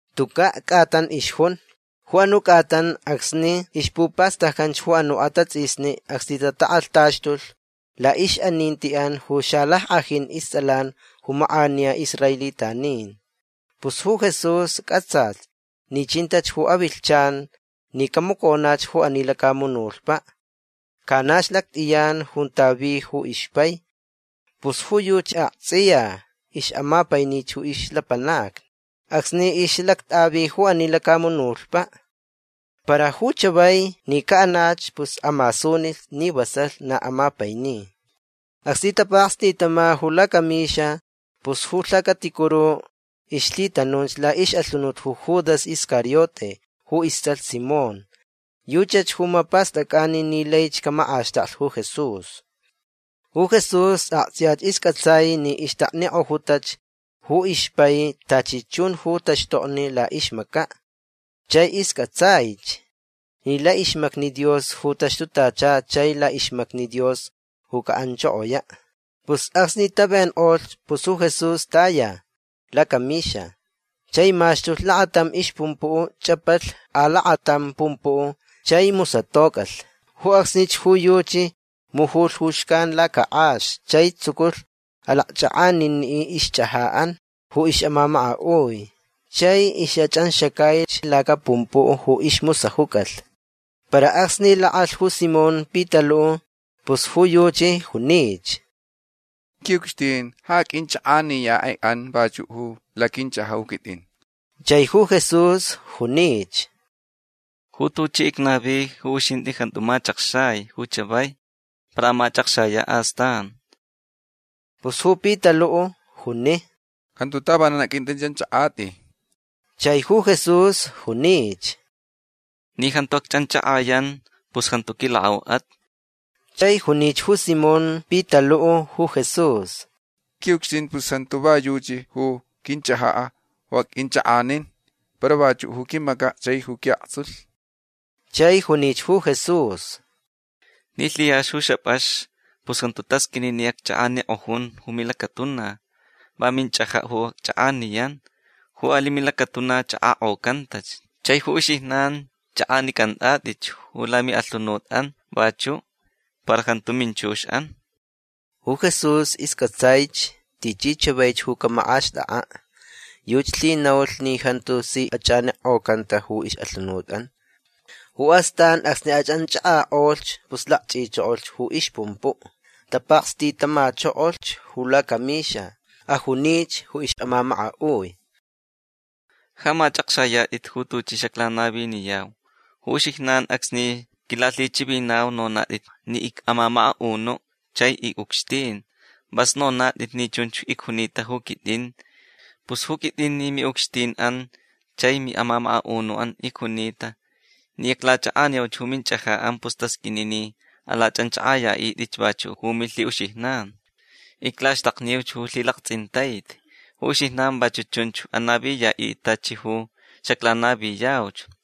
Tuca' c'atan ixjun. Ju anu' c'atan acsni ixpupastaccan ju anu' atats'isni acsni tatak'alhtaxtulh la'ix'aninti'an ju xalack'ajin ists'alan ju mak'aniya israelitanin. Pus ju Jesús c'atsalh ni chintach ju ix'avilhchan ni camaconach ju ani lacamunutpa'. Canach lact'iyan junta vi ju ixpai. Pus ju yuchi akts'iya ix'amapainich ju ixlapanacni acsni ix'alact'avi ju ani lacamunutpa'. Para ju chavai ni ca'anach pus amasunilh ni vasalh na amapaini. Acsni tapakstitama ju lacamixa pus ju lhacaticuru ixlhitanunch la'ix'alhunut ju Judas Iscariote ju ists'alh Simón. Yuchach ju mapast'ac'ani ni laich camak'axtaklh ju Jesús. Ju Jesús akts'iya isc'atsaich ni ixtaknik'ojutach ju ixpai tachi chun ju taxtokni la'ixmaca'. Chai isc'atsaich ni la'ixmacni Dios ju taxtutacha chai la'ixmacni Dios ju ca'anchokoya'. Pus acsni tavenk'olh pus ju Jesús taya lacamixa. Chai maxtulh lakatam ixpumpu'. Ch'apalh alakatam pumpu' chai musatoc'alh. Ju acsnich ju yuchi mujulh ju xcan lacak'ax chai tsuculh alakch'ak'anini' ixch'aja'an ju ix'amamaka'ui. Chai ix'ach'anxacaich lacapumpu' ju ismusajuc'alh. Para acsni lak'alh ju Simón Pitalu' pus ju yuchi junich: ―Qui'ucxtin ja aq'uinch'ak'aniya'i'an vachu' ju laquinch'aja' ju quit'in. Chai ju Jesús junich: ―Ju tuchi icnavi ju uxint'i jantu mach'akxai ju chavai. Para amach'akxaya' astan. Pus ju Pitalu' juni: ―Jantu tavanan aq'uint'ich'anch'ak'at'i. Chai ju Jesús junich: ―Ni jantu acch'anch'ak'ayan pus jantu quilak'au'at. Chai junich ju Simón Pitalu' ju Jesús: ―Qui'ucxtin pus jantu va yuchi ju quinch'aja' ju aq'uinch'ak'anin. Para vachu' ju quimaca' chaich ju qui'aktsulhch. Chai junich ju Jesús: ―Ni lhiyaxch ju xap'ax pus jantu tasq'uini ni acch'ak'anik'ojun ju milacatuna. Va minch'aja' ju acch'ak'aniyan. Ju ali' milacatuna ch'ak'ak'ocantach. Chai ju uxijnan ch'ak'anic'ant'at'itch ju lami'alhunut'an vachu'. Para jantu minchux'an. Ju Jesús isc'atsaich tichi chavaich ju camak'axt'ak'a'. Yuchi lhinaulh ni jantu si ach'ak'anik'ocanta ju ix'alhunut'an. Ju astan acsni ach'anch'ak'ak'olhch pus lakch'ichokolh ju ixpumpu'. Tapakstitamachokolh ju lacamixa. Ajunich ju ix'amamaka'ui: ―Ja mach'akxayat'it ju tuchi xaclanaviniyau. Ju uxijnan acsni quilalhichivinau nonat'it ni ic'amamaka'unu' chai ic'ucxtin. Vas nonat'it ni chunch icjunita ju quit'in. Pus ju quit'in ni mi'ucxtin'an chai mi'amamaka'unu'an icjunita ni iclach'ak'aniuch ju minch'aja'an pus tasq'uini ni alach'anch'ak'aya'it'itch vachu' ju milhi'uxijnan. Iclaxtakniuch ju lhilakts'intaiti. Ju uxijnan vachu' chunch anaviya'it'it tachi ju xaclanaviyauch.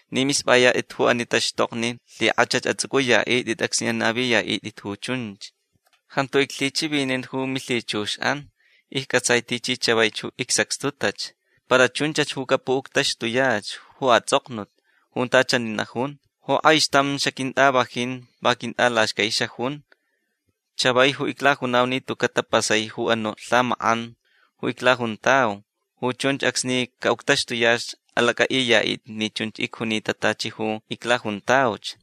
Ni misp'ayat'it ju ani taxtokni lhik'ach ju ats'uc'uya'it'it acsni anaviya'it'it ju chunch. Jantu iclhichivinin ju milhichux'an. Icc'atsai tichi chavaich ju icsacxtutach. Para chunchach ju capu'uctaxtuyach ju ats'oknut junta chani najun: “Ju k'aixtam xaquint'avajin va quint'alaxcai xajun”. Chavai ju iclajunau ni tuca' tapasai ju anu' lhamak'an ju iclajuntau. Ju chunch acsni ca'uctaxtuyach alac'a'iya'it'it ni chunch icjunita tachi ju iclajuntauch.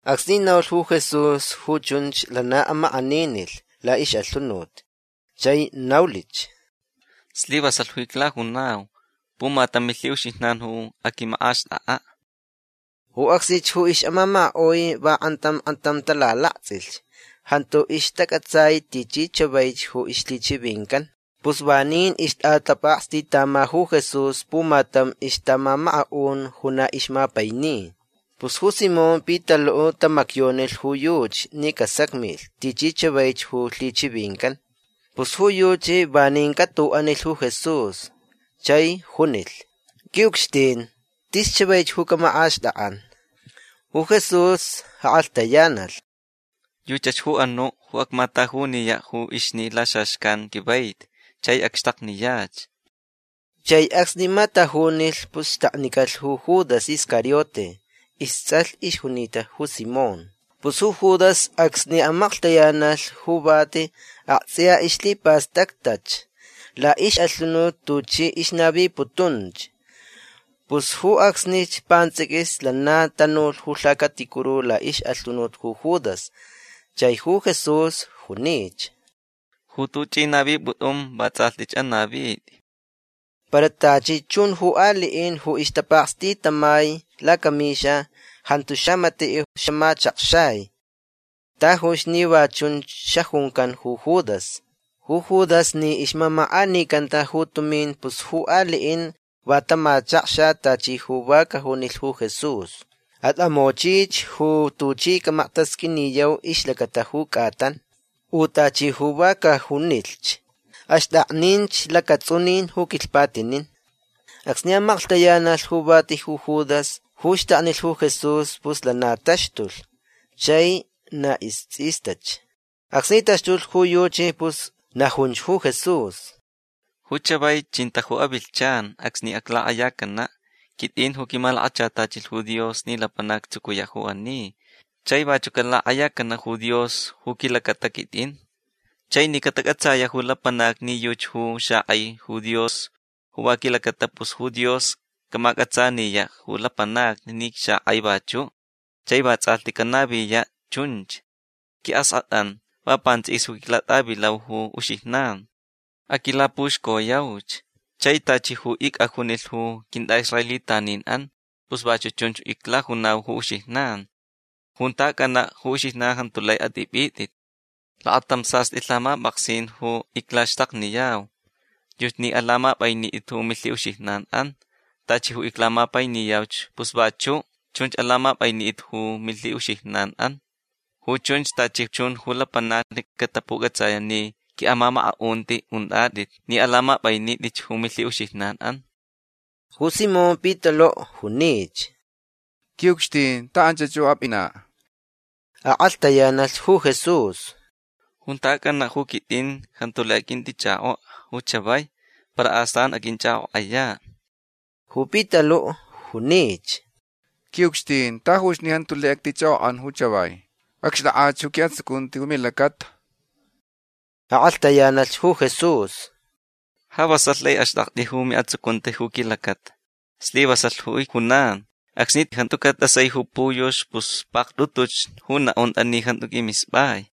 Acsni naulh ju Jesús ju chunch lana amak'aninilh la'ix'alhunut. Chai naulich: ―Slivasalh ju iclajunau. Pumatam milhi'uxijnan ju aquimak'axt'ak'a'. Ju acsnich ju ix'amamaka'ui va k'antam k'antam talalakts'ilh. Jantu ixtac'atsai tichi chavaich ju ixlhichivincan. Pus vanin ixt'atapakstitama ju Jesús pumatam ixtamamaka'un ju na ixmapaini. Pus ju Simón Pitalu' tamacyonilh ju yuchi ni casacmilh tichi chavaich ju lhichivincan. Pus ju yuchi vanin c'atu'anilh ju Jesús. Chai junilh: ―Qui'ucxtin tis chavaich ju camak'axt'ak'an. Ju Jesús ak'alhtayanalh: ―Yuchach ju anu' ju acmatajuniya' ju ixni' laxaxcan quivaiti chai acxtakniyach. Chai acsni matajunilh pus xtaknicalh ju Judas Iscariote. Ists'alh ixjunita ju Simón. Pus ju Judas acsni amaklhtayanalh ju vati akts'iya ixlhipastactach la'ix'alhunut tuchi ixnaviputunch. Pus ju acsnich pants'iquis lana tanulh ju lhacaticuru la'ix'alhunut ju Judas. Chai ju Jesús junich: ―Ju tuch'i navip'ut'un vats'alhch anavit'i. Para tachi chun ju ali'in ju ixtapakstitamai lacamixa jantu xamati' xamachakxai tajuch ni va chunch xajuncan ju Judas. Ju Judas ni ixmamak'anicanta ju tumin pus ju ali'in va tamachakxa tachi ju va cajunilh ju Jesús: “At'amochich ju tuchi camaktasq'uiniyau ixlacata ju c'atan”. U tachi ju va cajunilhch: “Axt'akninch lacats'unin ju quilhpatinin”. Acsni amaklhtayanalh ju vati ju Judas ju xtaknilh ju Jesús pus lana taxtulh. Chai na ists'istach. Acsni taxtulh ju yuchi pus najunch ju Jesús: ―Ju chavai chinta ju avilhchan acsni aclak'ayacana'. Quit'in ju quimalakachatachilh ju Dios ni lapanac actsucuya' ju ani. Chai vachu' calak'ayacana' ju Dios ju quilacata quit'in. Chai ni catac'atsaya' ju lapanacni ni yuchi ju xak'ai ju Dios ju va quilacata pus ju Dios camac'atsaniya' ju lapanacni ni icxak'ai vachu'. Chai vats'alhti canaviya' chunch. Qui'ask'at'an va pants'iquis ju iclat'avilau ju uxijnan. Aquilapuxcoyauch. Chai tachi ju ic'ajunilh ju quint'a'israelitanin'an pus vachu' chunch iclajunau ju uxijnan. Junta ac'ana' ju uxijnan jantu lai at'ip'it'it. Lakatam sast'i lhamap'aksin ju iclaxtakniyau. Yuchi ni alamap'ainit'it ju milhi'uxijnan'an. Tachi ju iclamapainiyauch pus vachu' chunch alamap'ainit'it ju milhi'uxijnan'an. Ju chunch tachi chun ju lapanacni catapuc'atsaya' ni qui'amamaka'unti unt'at'it ni alamap'ainit'itch ju milhi'uxijnan'an. Ju Simón Pitalu' junich: ―Qui'ucxtin ta anchach ju ap'ina'. Ak'alhtayanalh ju Jesús: ―Junta ac'ana' ju quit'in jantu lai aq'uint'ich'ak'ok'a ju chavai. Para astan aq'uinch'ak'ok'aya'. Ju Pitalu' junich: ―Qui'ucxtin tajuch ni jantu lai actich'ak'ok'an ju chavai. Acxt'ak'ach ju qui'atsucunti ju milacata. Ak'alhtayanalh ju Jesús: ―Ja vasalh lai axt'akt'i ju mi'atsucunti ju quilacata. Slivasalh ju icjunan. Acsni jantuca' t'asai ju puyux pus pakt'utuch ju na'unt'a ni jantu q'uimisp'ai.